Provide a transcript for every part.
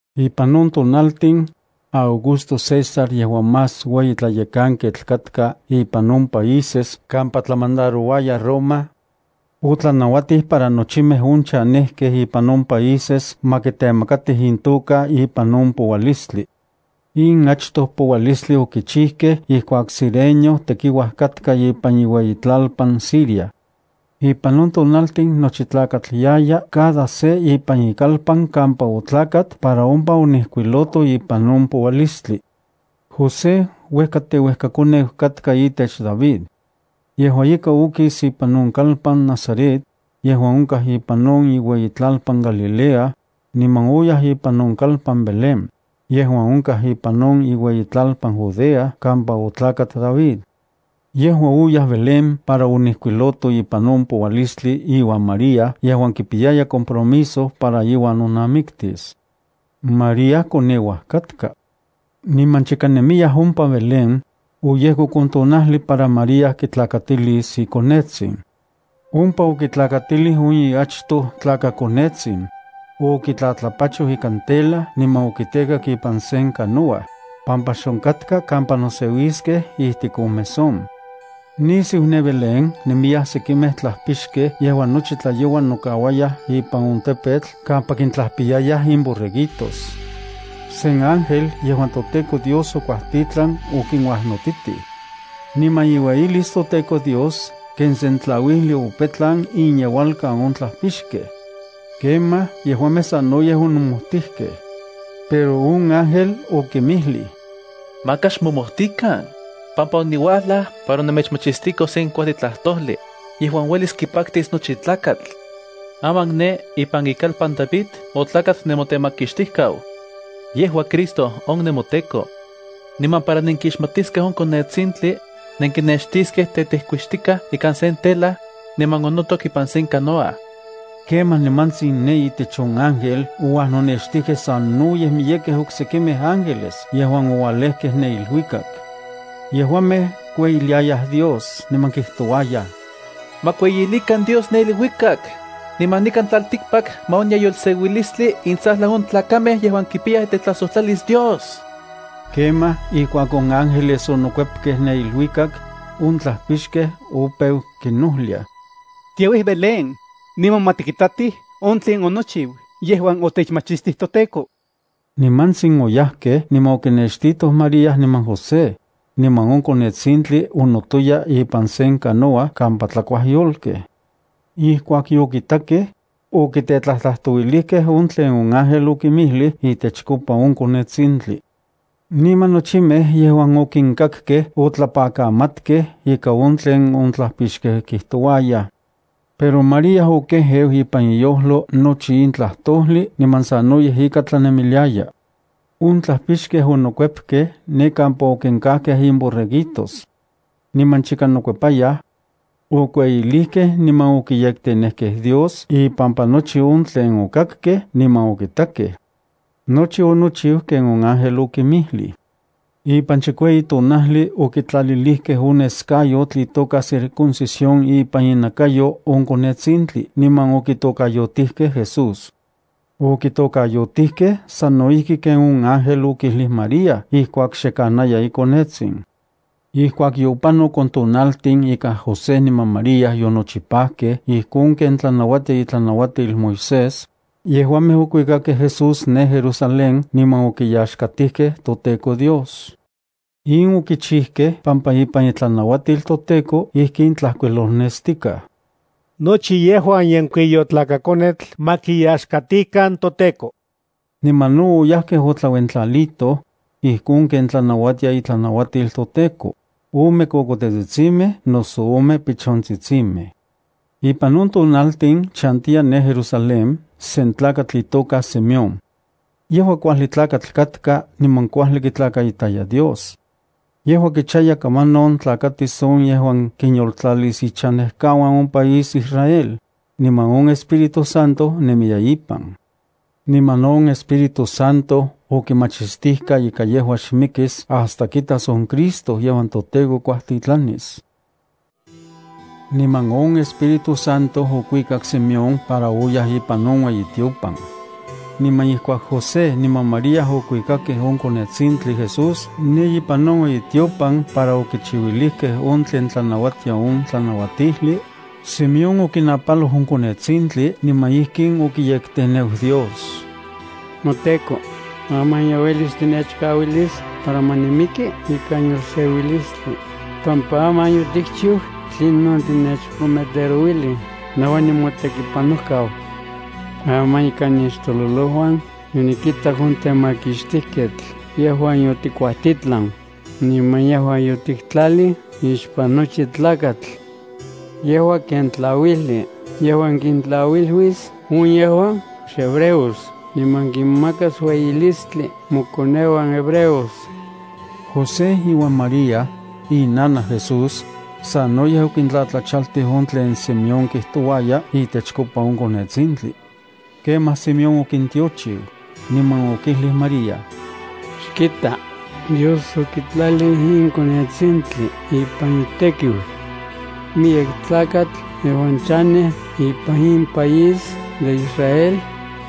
Ipan on tonaltin, Augusto César yejuan más ueyi tlayekanketl katka ipan on países kampa tlamandarouaya Roma, otlanauatij para nochimej on chanejkej ipan on países ma kitemakatij intoka ipan on poualistli. In achtoj poualistli okichijkej ijkuak Cirenio tekiuaj katka ipan iueyitlalpan Siria. Ipan on tonaltin nochi tlakatl yaya cada se ipan ikalpan kampa otlakat para ompa onijkuiloto ipan on poualistli. José uejka teuejkakoneu katka itech David. Yejua ika okis ipan on kalpan Nazaret, yejuan onkaj ipan on iueyitlalpan Galilea, niman oyaj ipan on kalpan Belén, yejuan onkaj ipan on iueyitlalpan Judea kampa otlakat David. Yejua oyaj Belén para onijkuiloto ipan on poualistli iuan María yejuan kipiyaya compromiso para iuan nonamiktis. María koneuaj katka. Niman chika nemiyaj ompa Belén, oyejkok on tonajli para María kitlakatilis ikonetsin. Ompa okitlakatilij on iachtoj tlakakonetsin. Okitlatlapachoj ikan tela niman okitekak ipan sen canoa, pampa xonkatka kampa noseuiskej ijtik on mesón. Nisiu ne Belén nemiyaj sekimej tlajpixkej yejuan nochi tlayoua nokauayaj ipan on tepetl kampa kintlajpiyayaj imborreguitos. Sen ángel yejuan toTEKO Dios okuajtitlan okinuajnotitij. Niman iueyilis toTEKO Dios ken sen tlauijli opetlan inyeualkan on tlajpixkej. Kemaj, yejuamej sanoyej onomojtijkej. Pero on ángel okinmijlij: —Maka xmomojtikan, pampa oniuajlaj para nemechmachistiko sen kuajli tlajtojli, yejuan uelis kipaktis nochi tlakatl. Aman ne ipan ikalpan David otlakat nemoTemakixtijkau. Yejua Cristo on nemoTEKO. Niman para nenkixmatiskej on konetsintli, nenkinextiskej tetejkuixtikaj ikan sen tela, niman onotok ipan sen canoa. Kemaj nimantsin ne itech on ángel ouajnonextijkej sanoyej miyekej oksekimej ángeles yejuan oualejkej ne iluikak. Yejuamej kueyiliayaj Dios niman kijtouayaj: ¡Ma kueyilikan Dios ne iluikak, niman nikan tlaltikpak ma onya yolseuilistli intsajlan on tlakamej yejuan kipiyaj itetlajsojtlalis Dios! Kemaj ijkuak on ángeles onokuepkej ne iluikak, on tlajpixkej opeu kinojliaj: —Tiauij Belén, niman ma tikitatij on tlen onochiu yejuan otechmachistij toTEKO. Nimantsin oyajkej niman okinextitoj María niman José, niman on konetsintli onotoya ipan sen canoa kampa tlakuaj yolkej. Ijkuak yokitakej, okitetlajtlajtouilijkej on tlen on ángel okinmijlij itechkopa on konetsintli. Niman nochimej yejuan okinkakkej otlapakamatkej ika on tlen on tlajpixkej kijtouayaj. Pero María okejeu ipan iyojlo nochi in tlajtojli niman sanoyej ika tlanemiliaya. On tlajpixkej onokuepkej ne kampa okinkajkej imborreguitos. Niman chika nokuepayaj, okueyilijkej niman okiyektenejkej Dios ipampa nochi on tlen okakkej niman okitakej. Nochi onochiu ken on ángel okinmijlij. Ipan chikueyi tonajli okitlalilijkej on neskayotl itoka circuncisión ipan inakayo on konetsintli niman okitokayotijkej Jesús. Okitokayotijkej sano ijki ken on ángel okijlij María ijkuak xe kanaya ikonetsin. Ijkuak yopanok on tonaltin ika José niman María yonochipajkej ijkon ken tlanauatia itlanauatil Moisés, yejuamej okuikakej Jesús ne Jerusalén niman okiyaxkatijkej toTEKO Dios. In okichijkej pampa ipan itlanauatil toTEKO ijkin tlajkuilolnestikaj: “Nochi yejuan yenkuiyotlakakonetl ma kiyaxkatikan toTEKO.” Niman no oyajkej otlauentlalitoj, ijkon ken tlanauatia itlanauatil toTEKO: ome kokotetsitsimej noso ome pichontsitsimej. Ipan on tonaltin chantiya ne Jerusalén sen tlakatl itoka Simeón. Yejua kuajli tlakatl katka, niman kuajli kitlakaitaya Dios. Yejua kichaya kamanon tlakatis on yejuan kinyoltlalis ichanejkauan on país Israel, niman on Espíritu Santo nemiya ipan. Niman on Espíritu Santo okimachistijka ika yejua xmikis hasta kitas on Cristo yejuan toTEKO kuajtitlanis. Niman on Espíritu Santo okuikak Simeón para oyaj ipan on ueyitiopan. Niman ijkuak José niman María okuikakej on konetsintli Jesús ne ipan on ueyitiopan para okichiuilijkej on tlen tlanauatia on tlanauatijli, Simeón okinapaloj on konetsintli niman ijkin okiyekteneu Dios: NoTEKO, aman ye uelis tinechkauilis para ma nimiki ikan yolseuilistli, pampa aman yotikchiu tlinon otinechprometerouilij nejua nimotekipanojkau. Aman ikan nixtololojuan yonikitak on Temakixtijketl yejuan yotikuajtitlan, niman yejuan yotiktlalij ixpan nochi tlakatl. Yejua ken tlauijli yejuan kintlauiluis on yejuan xhebreos niman kinmakas ueyilistli mokoneuan hebreos. José iuan María, inanaj Jesús, sanoyej okintlatlachaltij on tlen Simeón kijtouaya itechkopa on konetsintli. Kemaj Simeón okintiochiu, niman okijlij María: —Xkita, Dios okitlalij in konetsintli ipan itekiu. Miyek tlakatl yejuan chanej ipan in país de Israel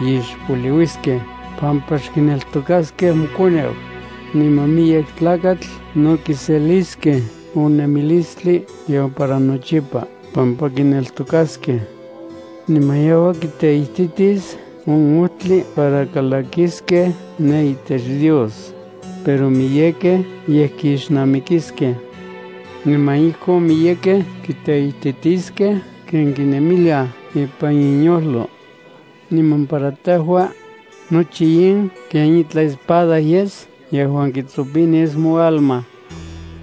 ixpoliuiskej pampa xkineltokaskej mokoneu, niman miyek tlakatl no kiseliskej on nemilistli yejuan para nochipa pampa kineltokaskej. Niman yejua kiteititis on ojtli para kalakiskej ne itech Dios, pero miyekej yej kixnamikiskej. Niman ijkon miyekej kiteititiskej ken kinemiliaj ipan inyojlo. Niman para tejua, nochi in ken itlaj espada yes yejuan kitsopinis moalma.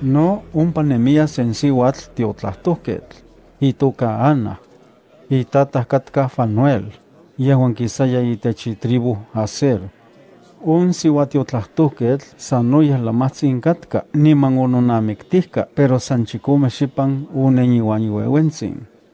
No, ompa nemiya sen siuatl tiotlajtojketl, itoka Ana. Itataj katka Fanuel, yejuan kisaya itech itribu Aser. On siuatiotlajtojketl sanoyej lamajtsin katka niman ononamiktijka pero san chikome xipan onen iuan iueuentsin,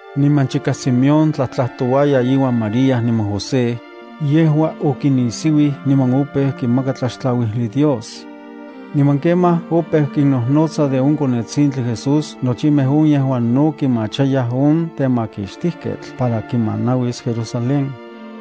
Niman chika Simeón tlajtlajtouaya iuan María niman José, yejua okinnisiuij niman opeu kimaka tlaxtlauijli Dios. Niman kemaj opeu kinnojnotsa de on konetsintli Jesús nochimej on yejuan no kimachayaj on temakixtijketl para kimanauis Jerusalén.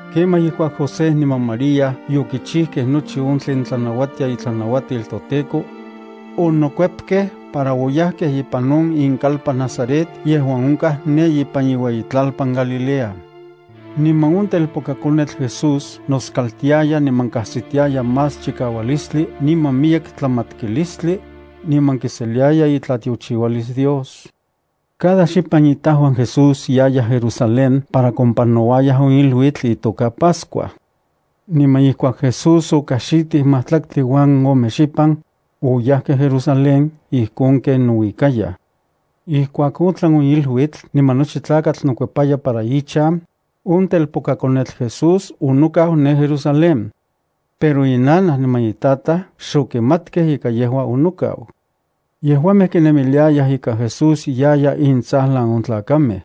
Kemaj ijkuak José niman María yokichijkej nochi on tlen tlanauatia itlanauatil toTEKO, onokuepkej para oyajkej ipan on inkalpan Nazaret yejuan onkaj ne ipan iueyitlalpan Galilea. Niman on telpokakonetl Jesús noskaltiaya niman kajsitiaya más chikaualistli niman miyek tlamatkilistli, niman kiseliaya itlatiochiualis Dios. Cada xipan itajuan Jesús yayaj Jerusalén para kompanouayaj on iluitl itoka Pascua. Niman ijkuak Jesús okajxitij majtlaktli uan ome xipan, oyajkej Jerusalén ijkon ken nouikayaj. Ijkuak otlan on iluitl niman nochi tlakatl nokuepaya para ichan, on telpokakonetl Jesús onokau ne Jerusalén. Pero inanaj niman itataj xokimatkej ika yejua onokau. Yejuamej kinemiliayaj ika Jesús yaya intsajlan on tlakamej.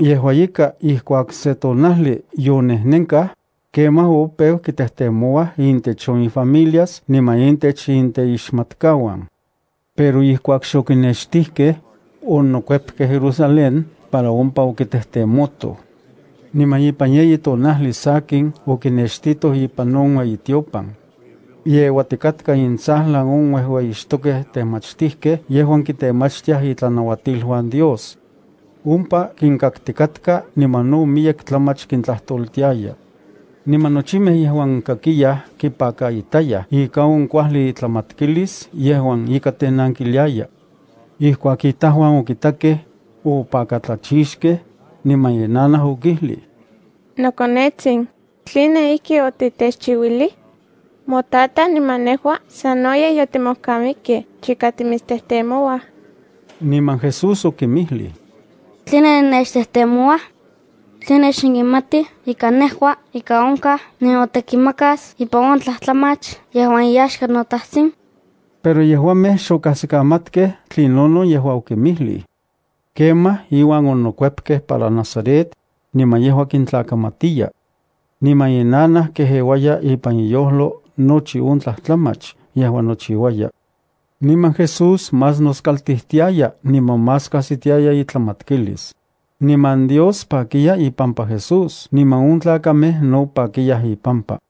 Yejua ika ijkuak se tonajli yonejnenkaj, kemaj opeu kitejtemouaj intech on ifamilias niman intech inteixmatkauan. Pero ijkuak xokinextijkej, onokuepkej Jerusalén para ompa okitejtemotoj. Niman ipan yeyi tonajli sakin okinextitoj ipan on ueyitiopan. Yeuatikatka intsajlan on uejueyixtokej temachtijkej yejuan kitemachtiaj itlanauatiluan Dios. Ompa kinkaktikatka niman no miyek tlamach kintlajtoltiaya. Niman nochimej yejuan kakiyaj kipakaitayaj ika on kuajli itlamatkilis yejuan ika tenankiliaya. Ijkuak itajuan okitakej, opakatlachixkej, niman inanaj okijlij: —Nokonetsin, ¿tline ijkin otitechchiuilij? Motataj niman nejua sanoyej yotimojkamikej chika timitstejtemouaj. Niman Jesús okinmijlij: —¿Tline nennechtejtemouaj? ¿Tline xnenkimatij ika nejua ika onkaj ninotekimakas ipan on tlajtlamach yejuan iyaxka noTajtsin? Pero yejuamej xokajsikamatkej tlinonon yejua okinmijlij. Kemaj, inuan onokuepkej para Nazaret, niman yejua kintlakamatiya. Niman inanaj kejeuaya ipan iyojlo nochi on tlajtlamach yejuan nochiuaya. Niman Jesús más noskaltijtiaya niman más kajsitiaya itlamatkilis. Niman Dios pakiya ipampa Jesús niman on tlakamej no pakiyaj ipampa.